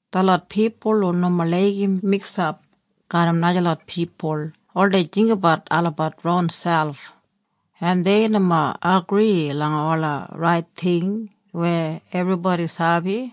Detlot pipul hu nomo laigim miksap garram najalot pipul oldei jinggabat olabat ronselp, en dei nomo agri langa ola rait ting weya ebribodi sabi.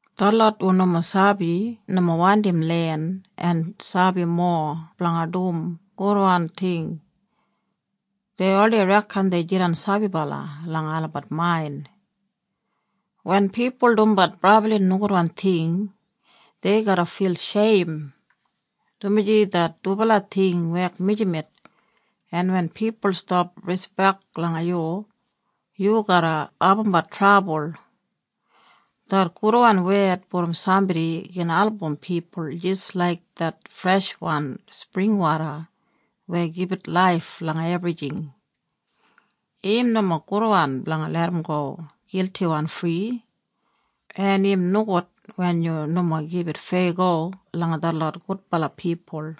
Detlot hu nomo sabi nomo wandim len en sabi mowa blanga dum gudwan ting. Dei oldei reken dei jidan sabibala langa olabat main. Wen pipul dumbat brabli nogudwan ting dei garra fil sheim, dumaji det dubala ting wek mijamet, en wen pipul stap rispek langa yu, yu garra abumbat trabul. Det gudwan wed brom sambodi gin album pipul jis laik det freshwan springwoda weya gibit laif langa ebrijing. Im nomo gudwan blanga larramgo giltiwan fri, en im nogud wen yu nomo gibit feyago langa detlot gudbala pipul.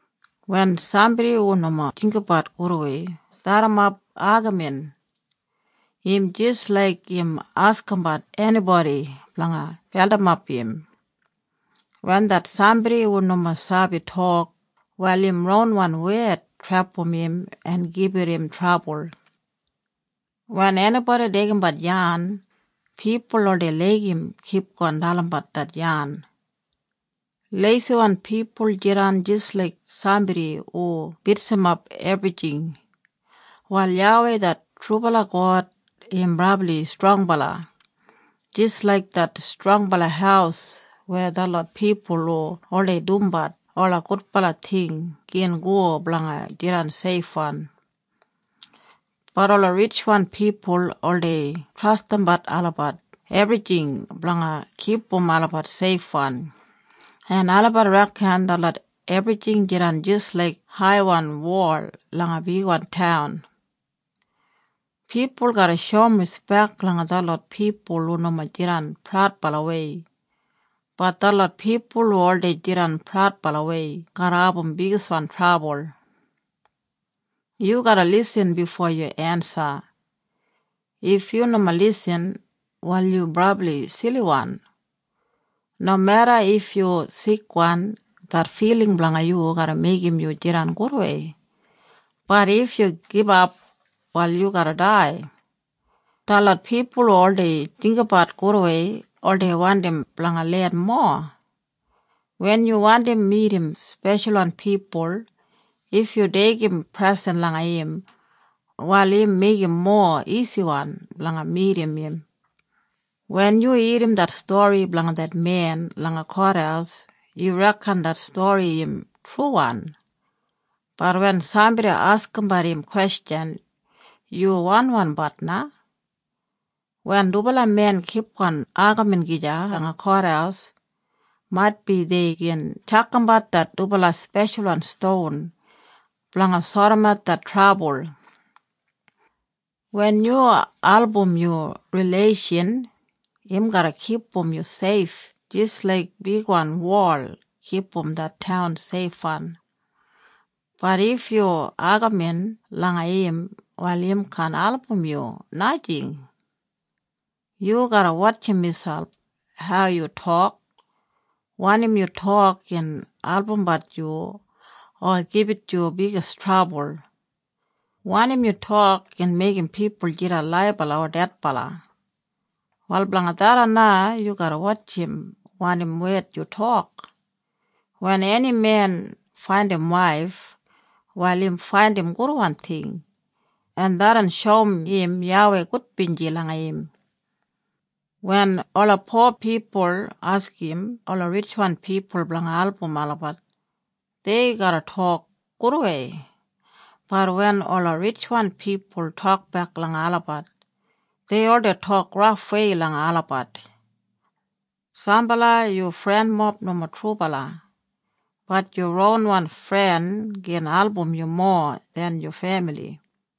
Wen sambodi hu nomo jinggabat gudwei stadimap agamin, im jis laik im askimbat enibodi blanga beldimap im. Wen det sambodi hu nomo sabi tok, wal im ronwan wed trepam im en gibit im trabul. Wen enibodi deigimbat yan, pipul oldei laigim kipgon dalimbat det yan. Leisiwan pipul jidan jis laik sambodi hu bitsimap ebrijing. Wal YAWEI det trubala God im brabli strongbala jis laik det strongbala haus weya detlot pipul hu oldei dumbat ola gudbala ting gin go blanga jidan seifwan. Bat ola ritjwan pipul oldei trastimbat olabat ebrijing blanga kipum olabat seifwan, en olabat reken detlot ebrijing jidan jis laik haiwan wol langa bigwan taun. Pipul garra shoum rispek langa detlot pipul hu nomo jidan praudbalawei, bat detlot pipul hu oldei jidan praudbalawei garra abum bigiswan trabul. Yu garra lisin bifo yu ensa. If yu nomo lisin, wal yu brabli siliwan. Nomeda if yu sikwan det filing blanga yu garra meigim yu jidan gudwei, bat if yu gibap, wal yu garra dai. Detlot pipul hu oldei jinggabat gudwei oldei wandim blanga len mowa. Wen yu wandim midim speshalwan pipul, if yu deigim presen langa im, wal im meigim mowa isiwan blanga midim im. Wen yu irrim det stori blanga det men langa kothaus yu reken det stori im truwan, bat wen sambodi askimbat im kwestjan, yu wanwanbat na. Wen dubala men kipgon agamin gija langa kothaus, maitbi dei gin tjakambat det dubala speshalwan ston, blanga sodimat det trabul. Wen yu album yu rileishan im garra kipum yu seif jis laik bigwan wol kipum det taun seifwan, bat if yu agamin langa im, wal im kaan album yu, najing. Yu garra wotjim miselp hau yu tok. Wanim yu tok gin albumbat yu o gibit yu bigis trabul. Wanim yu tok gin meigim pipul jidan laibala o dedbala. Wal blanga tharran na yu garra wotjim wanim wed yu tok. Wen eni men faindim waif wal im faindim gudwan ting, en tharran shoum im YAWEI gudbinji langa im. Wen ola po pipul askim ola ritjwan pipul blanga album olabat, dei garra tok gudwei, bat wen ola ritjwan pipul tokbek langa olabat, dei oldei tok rafwei langa olabat. Sambala yu frenmob nomo trubala, bat yu ronwan fren gin album yu mowa den yu femili.